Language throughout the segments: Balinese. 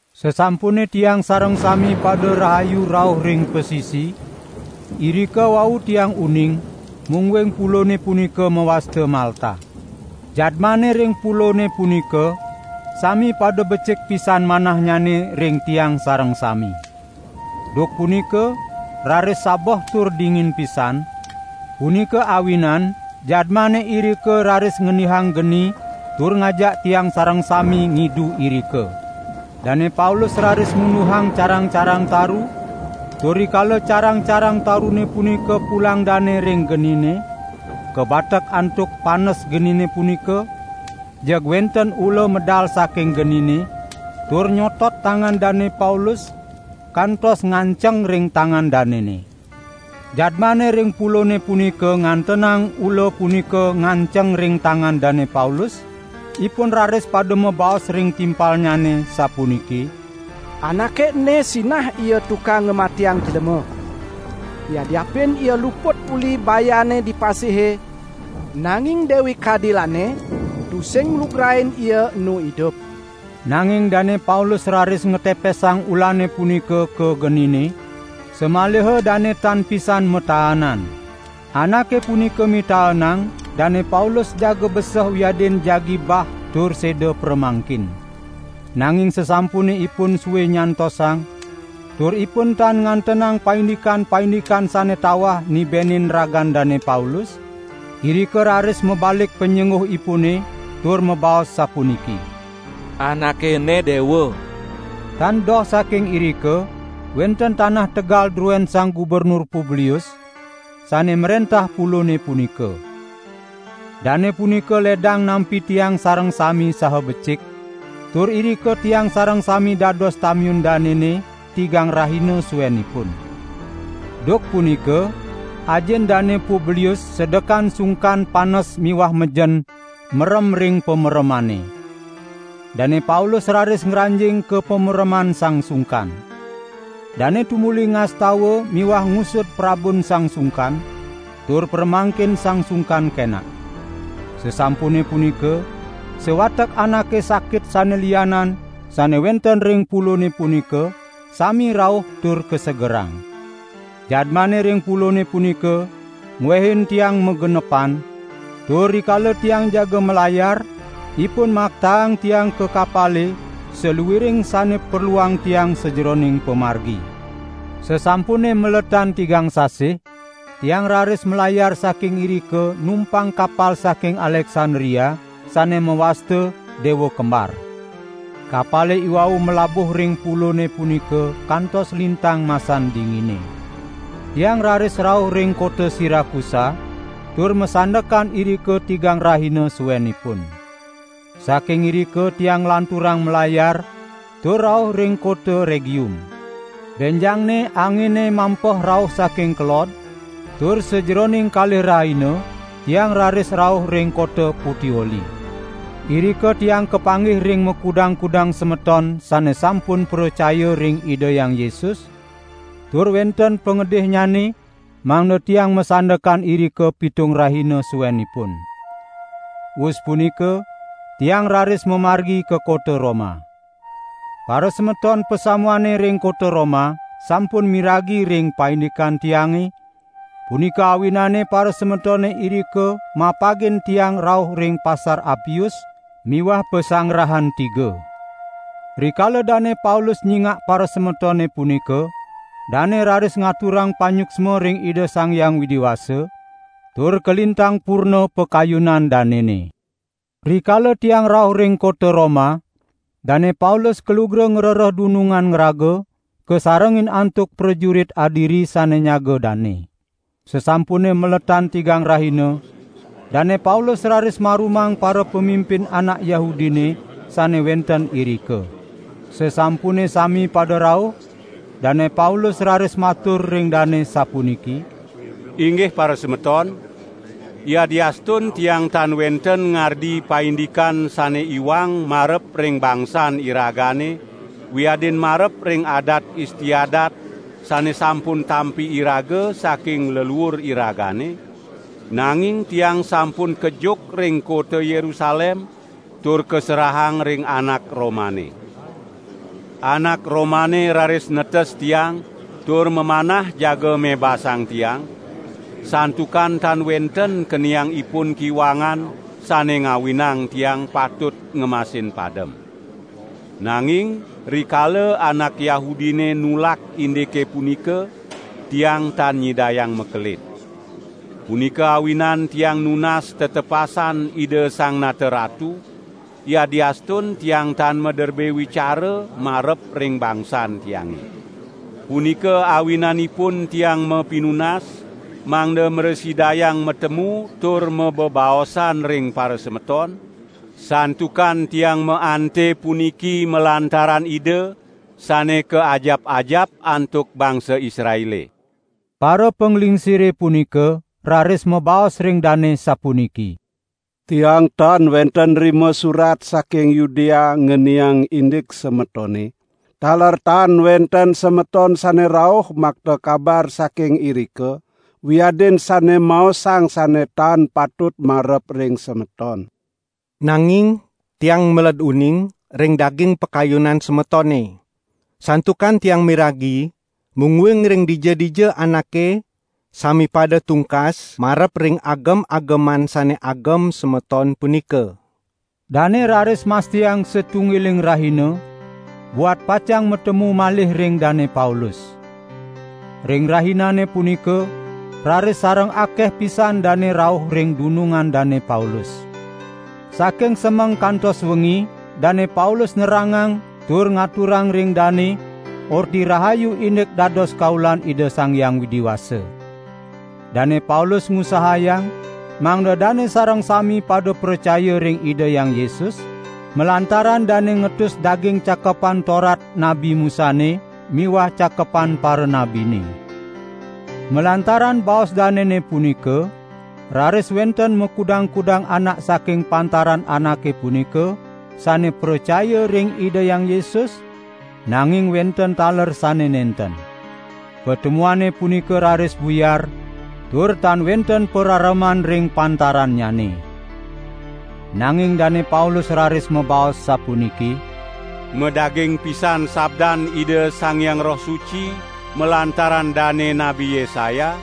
Sasampune tiang sareng sami pada rahayu rauh ring pasisi, irika wau tiang uning mungguing pulone punika mawasta Malta. Jadmane ring pulone punika sami pada becik pisan manahnyane ring tiang sareng sami. Duk punika raris sabeh tur dingin pisan, punika awinan jadmane irika raris ngendihang geni tur ngajak tiang sareng sami ngidu irika. Dane Paulus raris munduhang carang-carang taru, tur rikala carang-carang tarune punika pulang dane ring genine, kabatek antuk panes genine punika, jeg wenten ula medal saking genine, tur nyotot tangan Dane Paulus kantos nganceng ring tangan danene. Jadmane ring pulone punika ngantenang ula punika nganceng ring tangan Dane Paulus, ipun raris pada mabaos ring timpalnyane sapuniki: "Anake ene sinah ia tukang ngamatiang jlema. Yadiapin ia luput uli bayane di pasihe, nanging Dewi Kadilane tusing nglugrain ia enu idup." Nanging Dane Paulus raris ngatepesang ulane punika ka genine, samaliha dane tan pisan mataanan. Anake punika mitaenang Dane Paulus jaga beseh wiadin jagi bah tur seda pramangkin. Nanging sasampune ipun sue nyantosang, tur ipun tan ngantenang paindikan-paindikan sane tawah nibenin ragan Dane Paulus, irika raris mabalik panyengguhipune, tur mabaos sapuniki: "Anake ene dewa!" Tan doh saking irika wenten tanah tegal druen Sang Gubernur Publius, sane mrentah pulone punika. Dane punika ledang nampi tiang sareng sami saha becik, tur irika tiang sareng sami dados tamiun danene tigang rahina suenipun. Duk punika ajin Dane Publius sedekan sungkan panes miwah mejen merem ring pameremane. Dane Paulus raris ngranjing ka pamereman sang sungkan. Dane tumuli ngastawa miwah ngusud prabun sang sungkan, tur pramangkin sang sungkan kenak. Sasampune punika, sawatek anake sakit sane lianan sane wenten ring pulone punika sami rauh tur kasegerang. Jadmane ring pulone punika ngwehin tiang magenepan, tur rikala tiang jaga malayar, ipun maktaang tiang ka kapale saluiring sane perluang tiang sajeroning pamargi. Sasampune maletan tigang sasih, tiang raris malayar saking irika numpang kapal saking Aleksandria sane mawasta "Dewa Kembar". Kapale iwau malabuh ring pulone punika kantos lintang masan dingine. Tiang raris rauh ring kota Sirakusa tur masandekan irika tigang rahina suenipun. Saking irika tiang nglanturang malayar tur rauh ring kota Regium. Benjangne angine mampeh rauh saking kelod, tur sajeroning kalih rahina tiang raris rauh ring kota Putioli. Irika tiang kapanggih ring makudang-kudang semeton sane sampun pracaya ring Ida Hyang Yesus, tur wenten pangedihnyane mangda tiang masandekan irika pitung rahina suenipun. Wus punika tiang raris mamargi ka kota Roma. Parasemeton pasamuane ring kota Roma sampun miragi ring paindikan tiange, punika awinane parasemetone irika mapagin tiang rauh ring Pasar Apius miwah Pasanggarahan Tiga. Rikala Dane Paulus nyingak parasemetone punika, dane raris ngaturang panyuksma ring Ida Sang Hyang Widi Wasa tur kalintang purna pakayunan danene. Rikala tiang rauh ring kota Roma, Dane Paulus kalugra ngrereh dunungan ngraga, kasarengin antuk prajurit adiri sane nyaga dane. Sasampune maletan tigang rahina, Dane Paulus raris marumang parapamimpin anak Yahudine sane wenten irika. Sasampune sami pada rauh, Dane Paulus raris matur ring dane sapuniki: "Inggih parasemeton! Yadiastun tiang tan wenten ngardi paindikan sane iwang marep ring bangsan iragane wiadin marep ring adat istiadat sane sampun tampi iraga saking leluur iragane, nanging tiang sampun kejuk ring kota Yerusalem tur kaserahang ring anak Romane. Anak Romane raris netes tiang tur mamanah jaga mebasang tiang, santukan tan wenten keniang ipun kiwangan, sane ngawinang tiang patut ngemasin padem. Nanging rikala anak Yahudine nulak indike punika, tiang tan nyidayang makelid. Punika awinan tiang nunas tetepasan Ida Sang Nata Ratu, yadiastun tiang tan maderbe wicara marep ring bangsan tiange. Punika awinanipun tiang mapinunas, mangda mrasidayang matemu tur mabebaosan ring parasemeton, santukan tiang maante puniki malantaran Ida sane kaajap-ajap antuk bangsa Israele." Parapanglingsire punika raris mabaos ring dane sapuniki: "Tiang tan wenten nrima surat saking Yudea ngeniang indik semetone, taler tan wenten semeton sane rauh makta kabar saking irika, wiadin sane maosang sane tan patut marep ring semeton. Nanging tiang meled uning ring daging pakayunan semetone, santukan tiang miragi mungguing ring dija-dija anake sami pada tungkas marep ring agem-ageman sane agem semeton punika." Dane raris mastiang satunggiling rahina buat pacang matemu malih ring Dane Paulus. Ring rahinane punika raris sareng akeh pisan dane rauh ring dunungan Dane Paulus. Saking semeng kantos wengi Dane Paulus nerangang tur ngaturang ring dane Orti Rahayu indik dados kaulan Ida Sang Hyang Widi Wasa. Dane Paulus ngusahayang mangda dane sareng sami pada pracaya ring Ida Hyang Yesus, malantaran dane ngetus daging Cakepan Torat Nabi Musane miwah Cakepan Paranabine. Malantaran baos danene punika raris wenten makudang-kudang anak saking pantaran anake punika sane pracaya ring Ida Hyang Yesus, nanging wenten taler sane nenten. Patemuane punika raris buyar tur tan wenten parareman ring pantarannyane. Nanging Dane Paulus raris mabaos sapuniki: "Madaging pisan sabdan Ida Sang Hyang Roh Suci malantaran dane Nabi Yesaya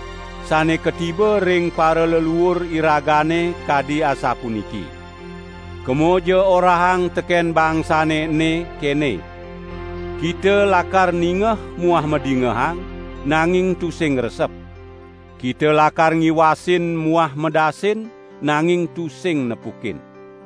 sane katiba ring paraleluur iragane kadi asapuniki: 'Kemaja orahang teken bangsane ene, kene: Kita lakar ningeh muah madingehang, nanging tusing ngresep. Kita lakar ngiwasin muah medasin, nanging tusing nepukin.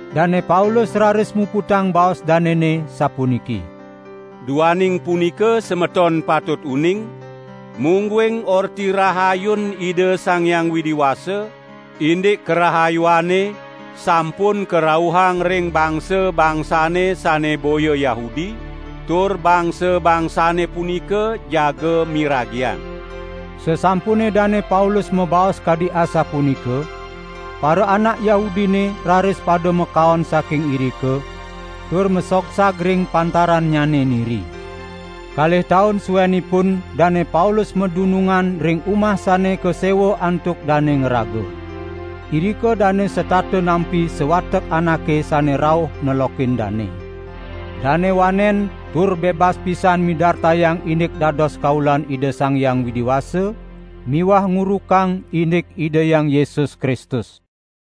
Dane Paulus raris muputang baos danene sapuniki: "Duaning punika semeton patut uning, mungguing Orti Rahayun Ida Sang Hyang Widi Wasa indik karahayuane sampun karauhang ring bangsa-bangsane sane boya Yahudi, tur bangsa-bangsane punika jaga miragiang." [ Sasampune Dane Paulus mabaos kadi asapunika, paraanak Yahudine raris pada makaon saking irika, tur masogsag ring pantarannyane niri.] Kalih taun suenipun Dane Paulus madunungan ring umah sane kasewa antuk dane ngraga. Irika dane setata nampi sawatek anake sane rauh nelokin dane. Dane wanen tur bebas pisan midartayang indik dados kaulan Ida Sang Hyang Widi Wasa miwah ngurukang indik Ida Hyang Yesus Kristus.